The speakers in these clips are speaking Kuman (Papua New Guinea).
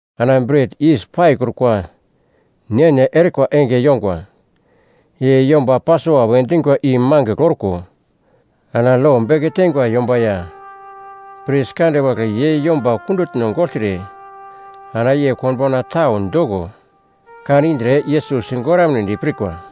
Ana Bret Yis Paikrukwa ne-ne erikwa enge yongwa i yomba Pasova we dingwa i mangigl orko ana lo beke teingwa yomba ya pris kande wagle ye yomba kundutno gogltre ana ye konbauna tau doko kan indre Yesus sigoramnedi pirkwa.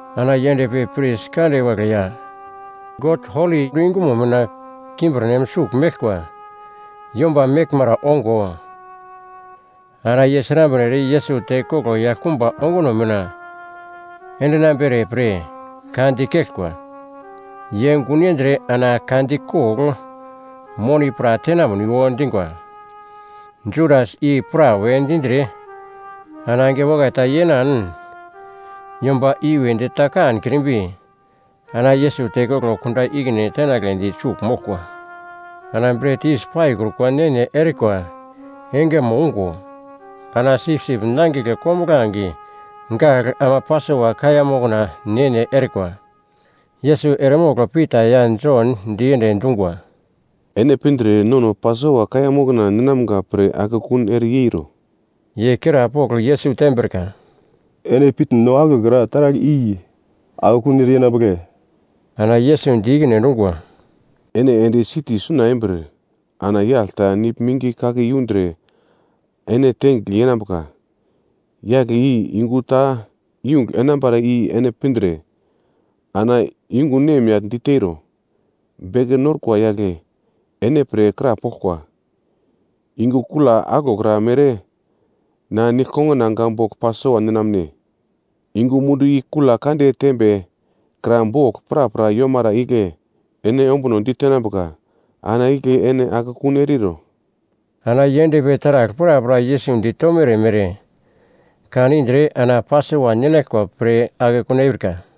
Ana ye endpi pris kande wagle ya God holi yungumo mina kimbirnem sugl meglkwa yomba meglmara ongo, ana ye srambre ere Yesus tekoglo yaglkumba onguno mina endinambere pre ka dikeglkwa. Ye gun yendre ana ka dikogl moni pra tenamniwo dingwa. Judas i pra we dindre ana enge wakai ta yenan yomba i-wedi ta kankrimbi, ana Yesus tekoglo kunda ikine tenagledi sugl moglkwa. Ana Bret Yis Paikrukwa ne-ne erikwa engemo ungo, ana sipsip nangigle kombuglange gagl ama Pasova kaiya mokna ne-ne erikwa. Yesus eremogl Pita ya Jon diende dungwa, “Ene pindre nono Pasova kaiya mokna ninamga pre akekun ere yeiro.” Ye krapogl Yesus tembrika, “Ene pitn no aglokra taragl i akekun ere yenambugle?” Ana Yesus di ikine endungwa, “Ene ende siti suna embir ana yagl ta nigl mingi kake yundre ene tengigl yenambuka. Yagle i yungu ta yungugl enambara i ene pindre, ana yungu nemyagl diteiro, ‘Beke Norkwa yagle ene pre krapoglkwa, “Yungu kula aglokra mere na disaipelna bogl Pasova ninamne?” ’ Ye yungu mundu i kula kande tembe kra bogl prapra yomara igle ene ombuno ditenambuka, ana igle ene akekun eriro.” Ana ye endpi taragl prapra Yesus ditomere mere kan indre ana Pasova ninaglkwa pre akekun eurika.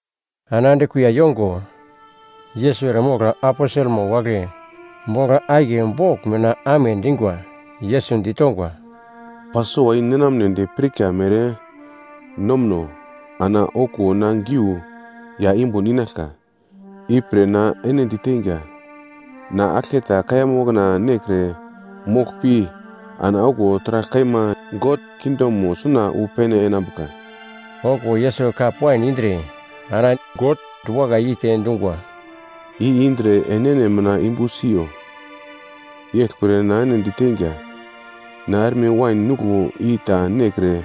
Ana ande kuiya yongo, Yesus eremogl aposelmo wagle bogl akiye bogl mina amedungwa. Yesus ditongwa, “Pasova i ninamnedi pirka mere nomuno ana okuwo na giu ya yumbun inaglka. Ipre na ene diteinga, na aglketa kaiya mokna nekre mogl pi, ana okuwo taragl kaima God kingdomo suna wu pene enambuka.” Okuwo Yesus kap wain indre, ana God diwakai yeite dungwa, “I indre enene mina yumbu siyo. Yeglpre na ene diteinga, na erme wain nuglo i ta nekre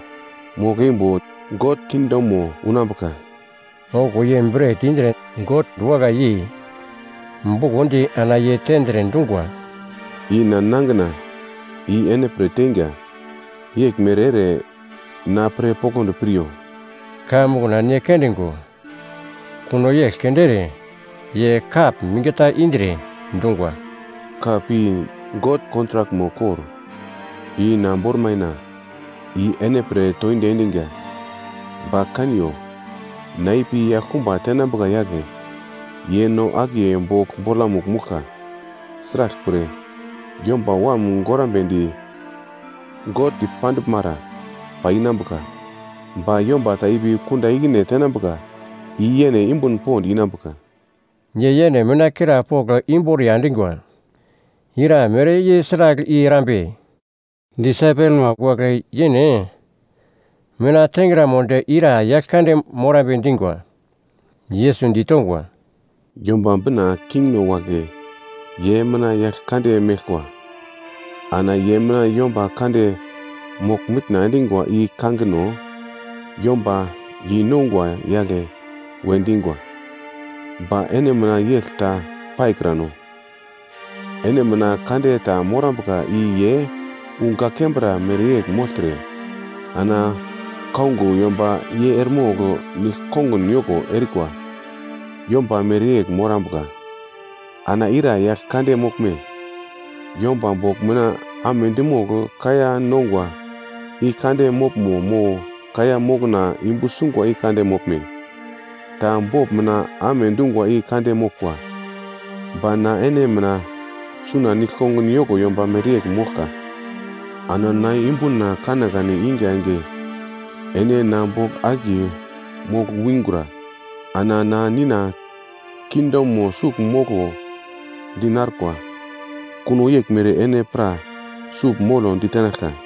mogl-eimbo God kingdomo unambuka.” Okuwo ye bret indre God diwakai yei, bukondi ana ye tendre, dungwa, “I na nangina, i ene pre teinga, yeglmere ere na pre poglodi piryo.” Kaiya mokna ne kondingo, kuno yegl keunde ere ye kap minge ta indre, dungwa, “Kap i God kontrakmo kor, i na bormaina, i ene pre toindi endiga. Ba kaniyo, na ipi yaglkumba tenambuka yagle, ye no akiye bogl bolamugl mouglka. Sraglpre, Yomba Wam gorambedi God dipanduglmara pai inambuka, ba yomba ta ipi kunda ikine tenambuka i yene yumbun pond inambuka.” Ye yene mina krapogl imboriya endingwa, ira mere ye sragl i erambe. Disaipelma wagle yene mina tengramodi ira yagl kande morambe dingwa. Yesus ditongwa, “Yomba Bina kingno wagle ye mina yagl kande meglkwa. Ana ye mina yomba kande mogl-mitna endingwa i kangino ‘Yomba yeinongwa yagle’ we dingwa. Ba ene mina yegl ta paikrano, ene mina kande ta morambuka i ye wu gak kembra mereyegl mogltre, ana kaungo yomba ye eremogl nigl-kongun yoko erikwa yomba mereyegl morambuka. Ana ira yagl kande moglme, yomba bogl mina amedi mogl kaiya nongwa i kande moglmo mo kaiya mokna yumbu sungwa i kande moglme? Ta bogl mina amedungwa i kande moglkwa. Ba na ene mina suna nigl-kongun yoko yomba mereyegl moglka. Ana na yumbuna kanekane iga enge ene na bogl akiye mogl wingura. Ana na Nina kingdomo sugl moglo di narkwa, kuno yeglmere ene pra sugl molo ditenaglka.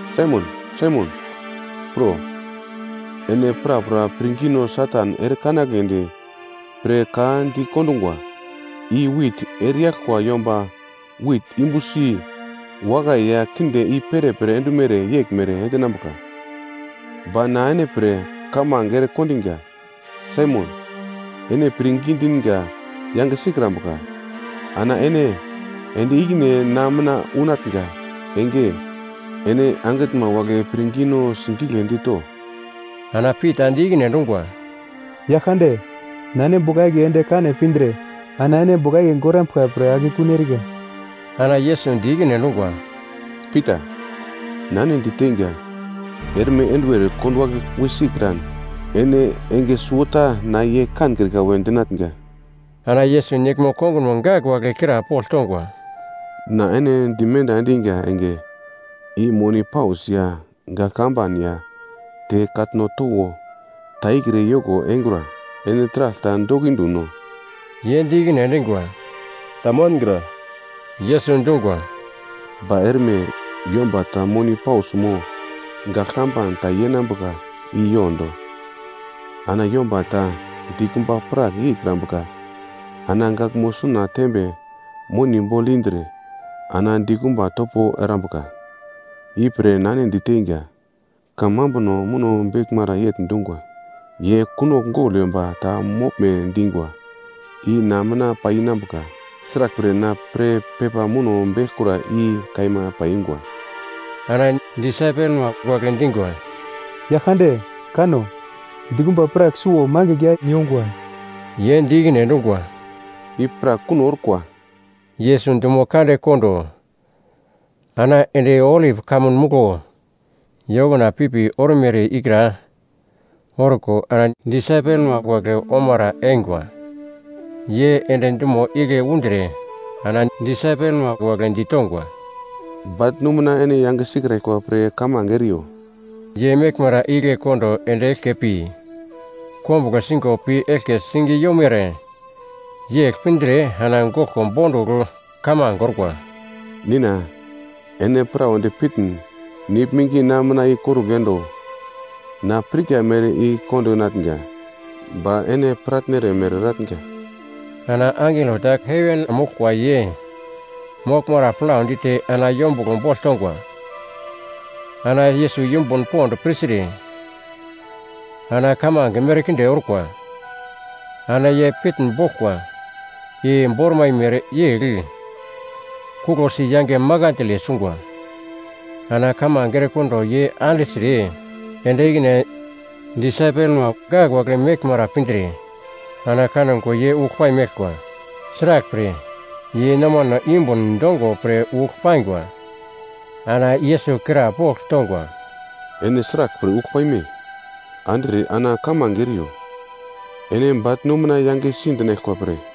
“Saimon, Saimon, pro! Ene prapra pirngino Satan ere kanagledi pre ka dikondungwa i wit ereyaglkwa yomba wit yumbusi, wakai ya kinde i-perepere endumere yeglmere endinambuka. Ba na ene pre kamange ere kondinga, Saimon, ene pirngi dinga yange sikrambuka. Ana ene ende ikine na mina unatnga enge, ene angitnma wagle pirngino sigigledi to.” Ana Pita di ikine endungwa, “Yaglkande, na ene bogl akiye ende kane pindre ana ene bogl akiye gorambuglka pre akekun erika.” Ana Yesus di ikine endungwa, “Pita, na ene diteinga, erme enduwer konduwagle wi sikran, ene enge suwota na ye kankrika we dinatnga.” Ana Yesus disaipelma wagle krapogl tongwa, “Na ene dimenda endinga enge i moni paus ya gagl kamban ya te katno towo ta ikre yoko engura. Ene taragl ta dokindu no?” Ye di ikine endingwa, “Tamangra.” Yesus dungwa, “Ba erme, yomba ta moni paus mo gagl kamban ta yenambuka i yondo. Ana yomba ta dikumba prak yeikrambuka ana gaglmo suna tembe moni bogl indre ana dikumba topo erambuka. Ipre na ene diteinga, kamambuno muno beglmara yegl dungwa, ‘Ye kunogl gogl yomba ta moglme dingwa.’ I na mina pai inambuka, sraglpre na pre pepa muno beglkura i kaima paiyungwa.” Ana disaipelma wagle dingwa, “Yaglkande, kano. Dikumba prak suwo mangigl ya yongwa.” Ye di ikine endungwa, “I pra kuno orkwa.” Yesus dumo kande kondo ana ende Olip Kamun Muglo ye okuna pipi ormere ikra orko ana disaipelma wagle omara eingwa. Ye ende dumo igle undre ana disaipelma wagle ditongwa, “Baglnu mina ene yange sikraglkwa pre kamange eriyo.” Ye meglmara igle kondo ende eglke pi, kombuglo singo pi eglke sing yomere yegl pindre ana goglko bondugl kamange orkwa, “Nina ene prawedi pitn, nigl mingi na mina i korugl endo, na pirka mere i kondinatnga, ba ene piratnere mere eratnga.” Ana angelo ta heven moglkwa ye moglmara plau dite ana yombuglo bogl tongwa. Ana Yesus yumbun pond pirtre, ana kamange merkinde orkwa, ana ye pitnboglkwa i bormai mereyegl kuglosi yange makandle sungwa. Ana kamange erekondo ye andigltre, ende ikine disaipelma wagle meglmara pindre, ana kango ye ugl paimeglkwa. Sraglpre, ye nomano yumbun dongo pre ugl paingwa. Ana Yesus krapogl tongwa, “Ene sraglpre ugl paime? Andigltre ana kamange eriyo, ene baglnu mina yangesi dinaglkwa pre.”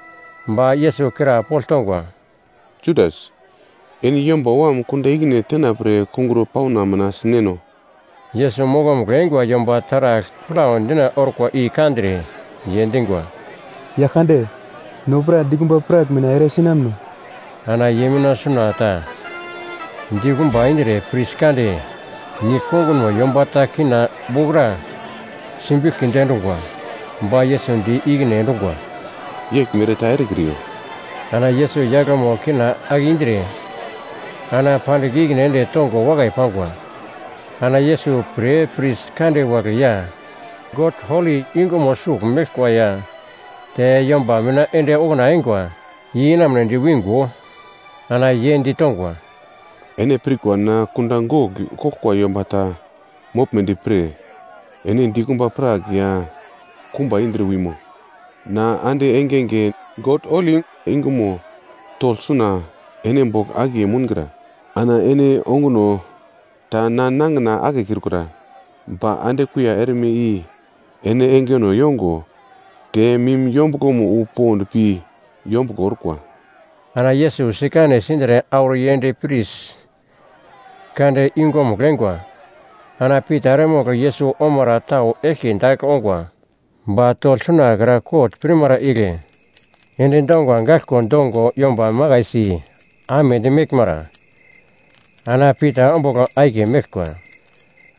ba Yesus krapogl tongwa, “Judas, ene Yomba Wam kunda ikine tenapre kungro pauna mina sineno?” Yesus mokomugl eingwa yomba taragl plau dina orkwa i kandre, ye dingwa, “Yaglkande, no pra dikumba prak mina ere sinamuno?” Ana ye mina suna ta dikumba indre pris kande nigl kongunmo yomba ta kina wokra simbiglkidi endungwa. Ba Yesus di ikine endungwa, “Yeglmere ta erekriyo!” Ana Yesus yaglmo kina ake indre, ana pandigl ikine ende tongo wakai pangwa. Ana Yesus pre pris kande wagle ya God holi yungumo sugl meglkwa ya te yomba mina ende okuna eingwa ye inamunedi wingo, ana ye ditongwa, “Ene pirkwa na kunda gogl koglkwa yomba ta moglmedi pre, ene dikumba prak ya kumba indre wimo? Na ande engenge God holi yungumo togl suna ene bogl akiye moungra, ana ene onguno ta na nangina akekrikura. Ba ande kuiya erme i ene engeno yongo te mim yombuglomo wu pond pi yombuglo orkwa.” Ana Yesus sikane sindre auro yend pris kande yungumugl eingwa. Ana Pita eremogl Yesus omara tau eglke dagl ongwa. Ba togl sunakra kot pirmara igle ende donga gaglkwa dongo yomba makaisi amedi meglmara, ana Pita ombugl akiye meglkwa.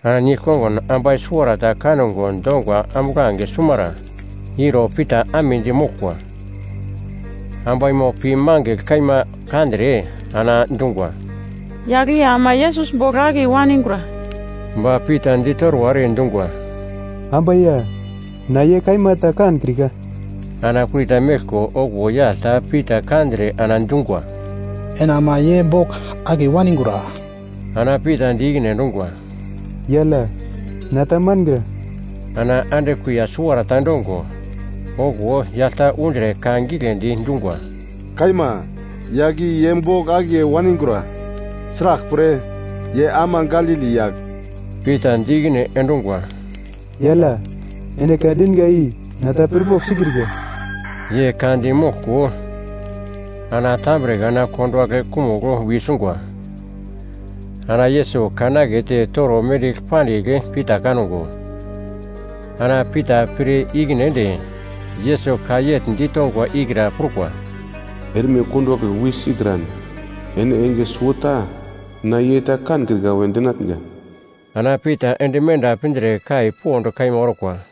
Ana nigl-kongun ambai suwarata kango donga ambuglange sumara iro Pita amedi moglkwa. Ambaimo pi mangigl kaima kandre ana dungwa, “Yagl i ama Yesus bogl akiye waningura!” Ba Pita ditorwa ere dungwa, “Ambai ya, na ye kaima ta kankrika.” Ana kurita meglko okuwo yagl ta Pita kandre ana dungwa, “Ene ama ye bogl akiye waningura!” Ana Pita di ikine endungwa, “Yagl ya, na ta mangra.” Ana ande kuiya suwarata endongo, okuwo yagl ta undre ka giglendi dungwa, “Kaima, yagl i ye bogl akiye waningura, sraglpre, ye ama Galili yagl.” Pita di ikine endungwa, “Yagl ya, ene ka dinga i na ta pirpogl sikrika.” Ye ka di moglko ana tambre kana konduwagle kumugl wi sungwa. Ana Yesus kan akete toro mendigl pandigl Pita kango, ana Pita pir ikine ende Yesus ka yegl ditongwa ikra prukwa, “Erme konduwagle wi sikran, ene enge suwota na ye ta kankrika we dinatnga.” Ana Pita ende menda pindre kai pond kaima orkwa.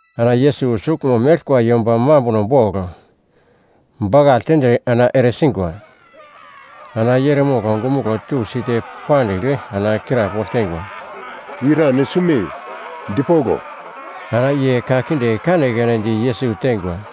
Ana Yesus suglmo meglkwa yomba mambuno bogl bakagl tendre ana eresingwa. Ana ye eremogl ongumuglo tusi te pandigl ana krapogl teingwa, “Ira ene sume, dipoglo!” Ana ye ka kinde kanekane di Yesus teingwa.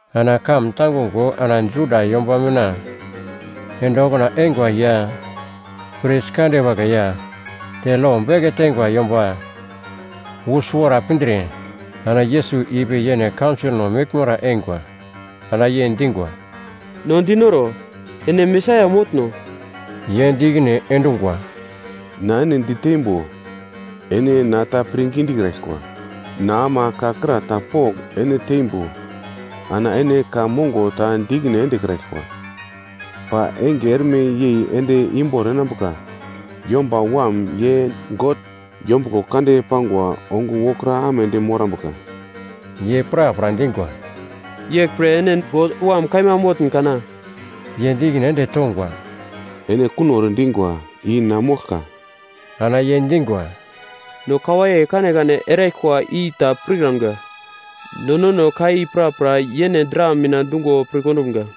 Ana kamun tangungo ana Juda yomba mina ende okuna eingwa ya pris kande wagle ya te lo beke teingwa yomba wu suwara pindre, ana Yesus ipi yene kaunsolno meglmara eingwa. Ana ye dingwa, “No dinoro, ene Mesaia motno?” Ye di ikine endungwa, “Na ene diteimbo ene na ta pirngi dikraglkwa. Na ama ka kra ta pogl ene teimbo ana ene ka mongo ta di ikine endekraglkwa. Ba enge erme yei ende imbor enambuka, Yomba Wam ye God yombuglo kande pangwa, ongo wokra amedi morambuka.” Ye prapra dingwa, “Yeglpre ene God Wam kaima motn kana?” Ye di ikine ende tongwa, “Ene kuno ere dingwa, i na moglka.” Ana ye dingwa, “No ka waiye kanekane eraglkwa i ta pirkramga, no nono ka i prapra yene dra mina dungo pir kondumga.”